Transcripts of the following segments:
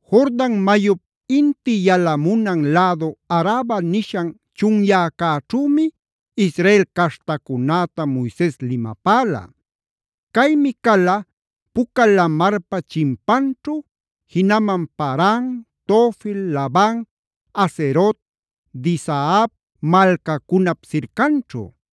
Jordan mayup inti yalamunan lädu Araba nishan chunyäcäćhümi Israel caśhtacunäta Moises limapäla. Caymi cala Puca Lamarpa chimpanćhu, jinaman Paran, Tofel, Laban, Hazerot, Dizahab malcacunap sircanćhu.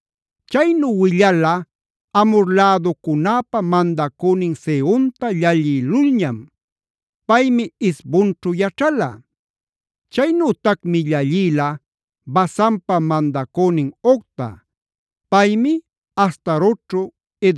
Chaynu willala Amhora läducunäpä mandacünin Sehonta llallïlulñam; paymi Hesbonćhu yaćhala. Chaynütacmi llallïla Basanpa mandacünin Ogta; paymi Astarotćhu,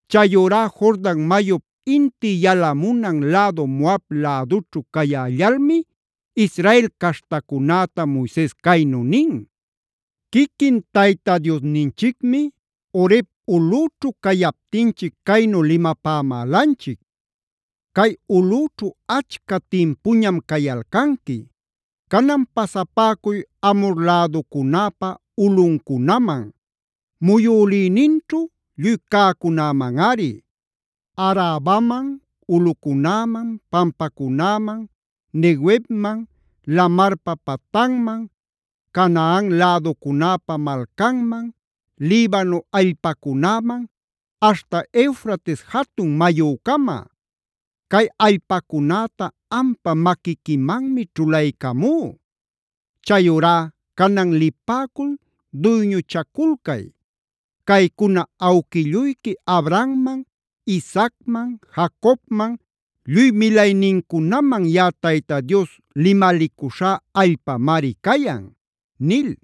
Chayurá Jordan mayup inti yalamunan lädu Moab lädućhu cayällalmi Israel caśhtacunäta Moises caynu nin: “Quiquin Tayta Diosninchicmi Horeb ulꞌüćhu cayaptinchic caynu limapämälanchic: ‘Cay ulꞌüćhu achca timpuñam cayalcanqui. Canan pasapäcuy Amhor läducunäpa ulꞌuncunaman; muyülïninćhu lluy cäcunämanꞌari: Arabaman, ulꞌucunäman, pampacunäman, Neguevman, lamarpa patanman, Canaan läducunäpa malcanman, Libano allpacunäman, aśhta Eufrates jatun mayücama. Cay allpacunäta ampa maquiquimanmi ćhulaycamú. Chayurá canan lipäcul duyñuchaculcay. Caycuna awquilluyqui Abrahamman, Isaacman, Jacobman, lluy milaynincunaman yaꞌa Tayta Dios limalicuśhá allpamari cayan’ nil.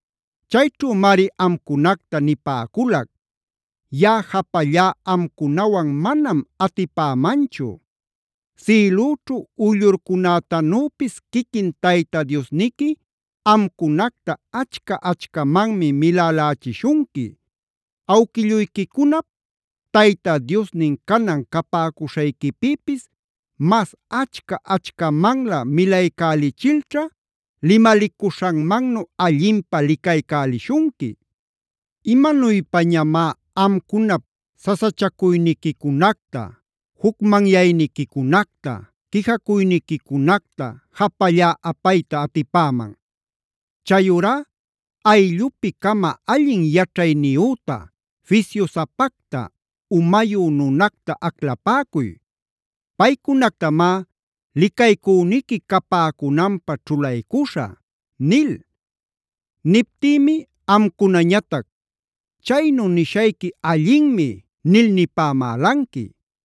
“Chayćhümari amcunacta nipäculac: ‘Yaꞌa japallá amcunawan manam atipämanchu. Sïlüćhu uyllurcunätanüpis quiquin Tayta Diosniqui amcunacta achca-achcamanmi milälächishunqui. ¡Awquilluyquicunap Tayta Diosnin canan capäcuśhayquipïpis mas achca-achcamanlä milaycälichilćha limalicuśhanmannu allinpä licaycälishunqui! ¿Imanuypañamá amcunap sasachacuyniquicunacta, jucmanyayniquicunacta, quijacuyniquicunacta japallá apayta atipäman? Chayurá ayllupi-cama allin yaćhayniyüta, fisyusapacta, umayu nunacta aclapäcuy. Paycunactamá licaycüniqui capäcunanpä ćhulaycuśhä’ nil. “Niptïmi amcunañatac: ‘Chaynu nishayqui allinmi’ nil nipämälanqui.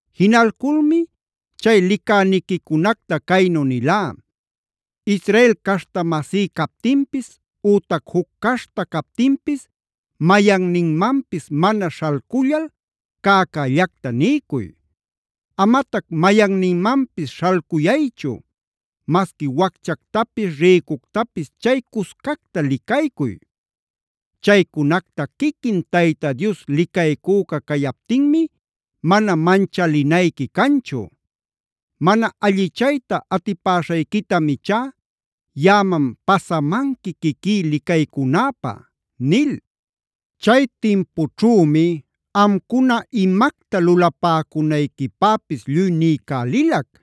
Jinalculmi chay licäniquicunacta caynu nilá: ‘Israel caśhta-masí captinpis ütac juc caśhta captinpis mayanninmanpis mana śhalcullal cäcällacta niycuy. Amatac mayanninmanpis śhalcuyaychu; masqui wacchactapis, rïcuctapis chay cuscacta licaycuy. Chaycunacta quiquin Tayta Dios licaycüca cayaptinmi mana manchalinayqui canchu. Mana allichayta atipäśhayquitam ichá yaꞌaman pasamanqui quiquí licaycunäpä’ nil. “Chay timpućhümi amcuna imacta lulapäcunayquipäpis lluy niycälilac.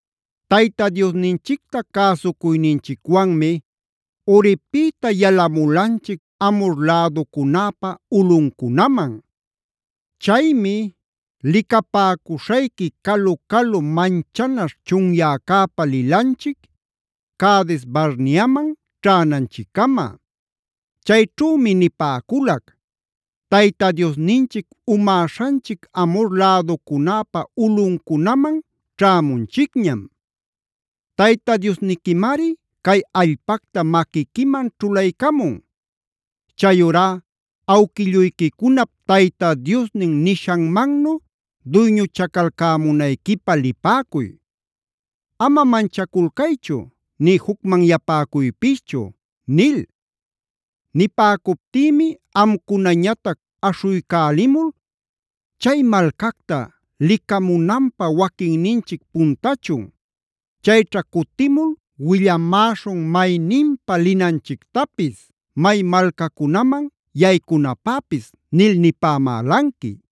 “Tayta Diosninchicta cäsucuyninchicwanmi Horebpïta yalamulanchic Amhor läducunäpa ulꞌuncunaman. Chaymi licapäcuśhayqui calu-calu manchanaśh chunyäcäpa lilanchic, Cades-barneaman ćhänanchiccama. Chayćhümi nipäculac: ‘Tayta Diosninchic umäśhanchic Amhor läducunäpa ulꞌuncunaman ćhämunchicñam. Tayta Diosniquimari cay allpacta maquiquiman ćhulaycamun. Chayurá awquilluyquicunap Tayta Diosnin nishanmannu duyñuchacalcämunayquipä lipäcuy. Ama manchaculcaychu nï jucmanyapäcuypischu’ nil. Nipäcuptïmi amcunañatac aśhuycälimul: ‘Chay malcacta licamunanpä waquinninchic puntachun. Chayćha cutimul willamäśhun mayninpa linanchictapis, may malcacunaman yaycunapäpis’ nil nipämälanqui.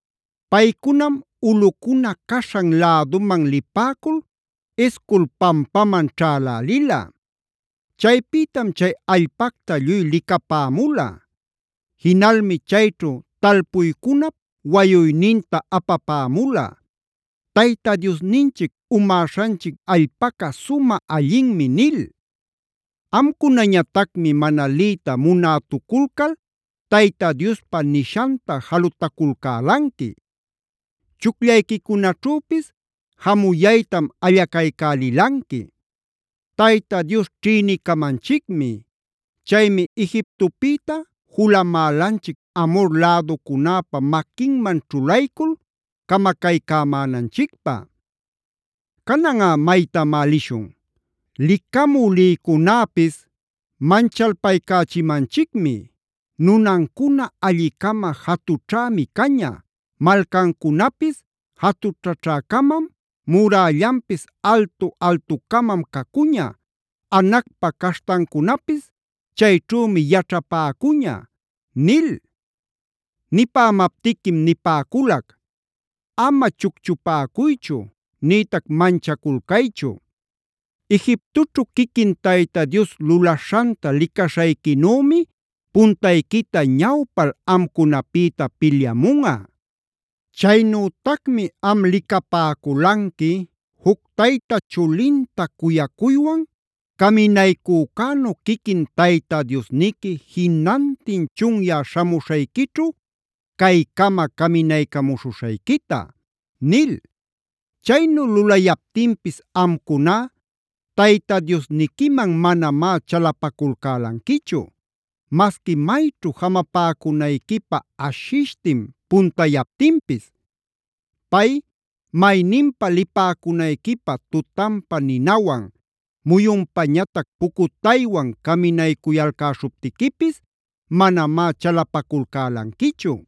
Paycunam ulꞌucuna caśhan läduman lipäcul Escol pampaman ćhälälila. Chaypïtam chay allpacta lluy licapämula. Jinalmi chayćhu talpuycunap wayuyninta apapämula: ‘Tayta Diosninchic umäśhanchic allpaca sumä allinmi’ nil. Amcunañatacmi mana liyta munätuculcal Tayta Diospa nishanta jalutaculcälanqui.c Chucllayquicunaćhüpis jamuyaytam allacaycälilanqui: ‘Tayta Dios ćhïnicamanchicmi. Chaymi Egiptopïta julamälanchic Amhor läducunäpä maquinman ćhulaycul camacaycämänanchicpä. ¿Cananꞌa maytamá lishun? Licamü lïcunäpis manchalpaycächimanchicmi: “Nunancuna alli-cama jatućhämi caña, malcancunapis jatućhäcamam, murällanpis altu-altucamam cacuña, Anacpa caśhtancunapis chayćhümi yaćhapäcuña” ’ nil. “Nipämaptiquim nipäculac: ‘Ama chucchupäcuychu, nïtac manchaculcaychu. Egiptoćhu quiquin Tayta Dios lulaśhanta licaśhayquinümi puntayquita ñawpal amcunapïta pilyamunꞌa.d Chaynütacmi am licapäculanqui juc tayta chulinta cuyacuywan caminaycücänu quiquin Tayta Diosniqui jinantin chunyä śhamuśhayquićhu caycama caminaycamuśhuśhayquita’ nil. Chaynu lulayaptinpis amcuná Tayta Diosniquiman manamá chalapaculcälanquichu,e masqui mayćhu jamapäcunayquipä ashishtin puntayaptinpis. Pay mayninpä lipäcunayquipä tutanpa ninawan, muyunpañatac pucutaywan caminaycuyalcäśhuptiquipis manamá chalapaculcälanquichu.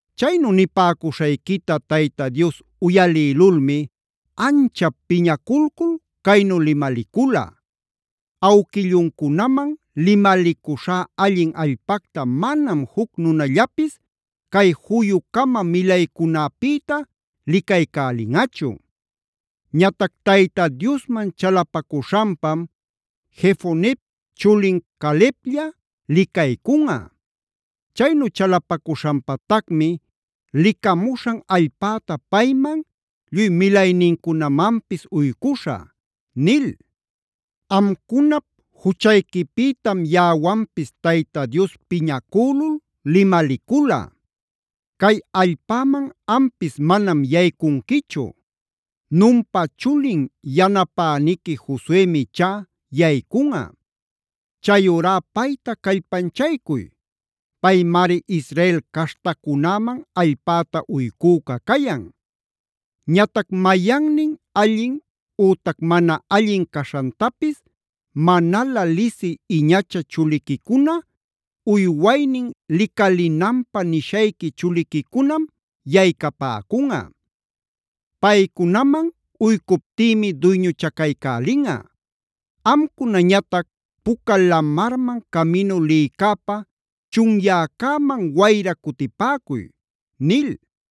“Chaynu nipäcuśhayquita Tayta Dios uyalïlulmi anchap piñaculcul caynu limalicula: ‘Awquilluncunaman limalicuśhá allin allpacta manam juc nunallapis cay juyu-cama milaycunäpïta licaycälinꞌachu.f Ñatac Tayta Diosman chalapacuśhanpam Jefonep chulin Caleblla licaycunꞌa; chaynu chalapacuśhanpatacmi licamuśhan allpäta payman, lluy milaynincunamanpis uycuśhä’ nil. “Amcunap juchayquipïtam yaꞌawanpis Tayta Dios piñacülul limalicula: ‘Cay allpäman ampis manam yaycunquichu. Nunpa chulin yanapäniqui Josuemi ichá yaycunꞌa. Chayurá payta callpanchaycuy. Paymari Israel caśhtacunäman allpäta uycüca cayan. Ñatac mayannin allin ütac mana allin caśhantapis manalä lisï iñacha chuliquicuna, uywaynin licalinanpä nishayqui chuliquicunam yaycapäcunꞌa. Paycunaman uycuptïmi duyñuchacaycälinꞌa. Amcunañatac Puca Lamarman caminu lïcäpä chunyäcäman wayra cutipäcuy’ nil.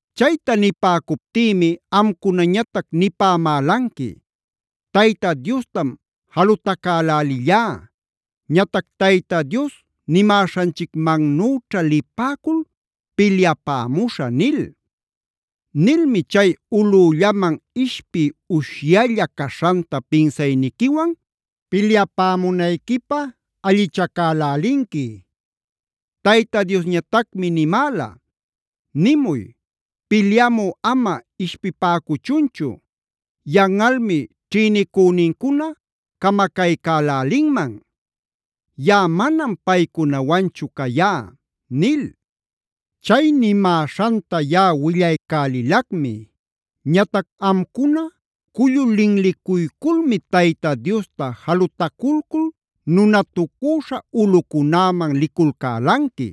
“Chayta nipäcuptïmi amcunañatac nipämälanqui: ‘Tayta Diostam jalutacälälillá. Ñatac Tayta Dios nimäśhanchicmannüćha lipäcul pilyapämuśhä’ nil. Nilmi chay ulꞌüllaman ishpiy ushyalla caśhanta pinsayniquiwan pilyapämunayquipä allichacälälinqui. Tayta Diosñatacmi nimäla: ‘Nimuy: pilyamü ama ishpipäcuchunchu; yanꞌalmi ćhïnicünincuna camacaycälälinman. Yaꞌa manam paycunawanchu cayá’ nil. “Chay nimäśhanta yaꞌa willaycälilacmi. Ñatac amcuna cullu linlicuyculmi Tayta Diosta jalutaculcul nunatucüśha ulꞌucunäman liculcälanqui.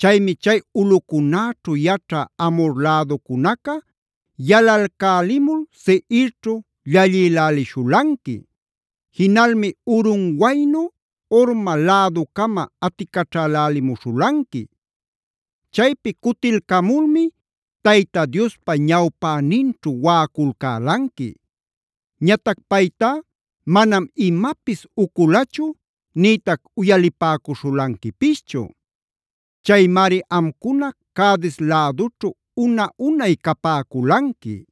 Chaymi chay ulꞌucunäćhu yaćhä Amhor läducunaca yalalcälimul Seirćhu llallïlälishulanqui. Jinalmi urunwaynu Horma läducama aticaćhälälimuśhulanqui. Chaypi cutilcamulmi Tayta Diospa ñawpäninćhu waꞌaculcälanqui. Ñatac paytá manam imapis uculachu nïtac uyalipäcuśhulanquipischu. Chaymari amcuna Cades lädućhu una-unay capäculanqui.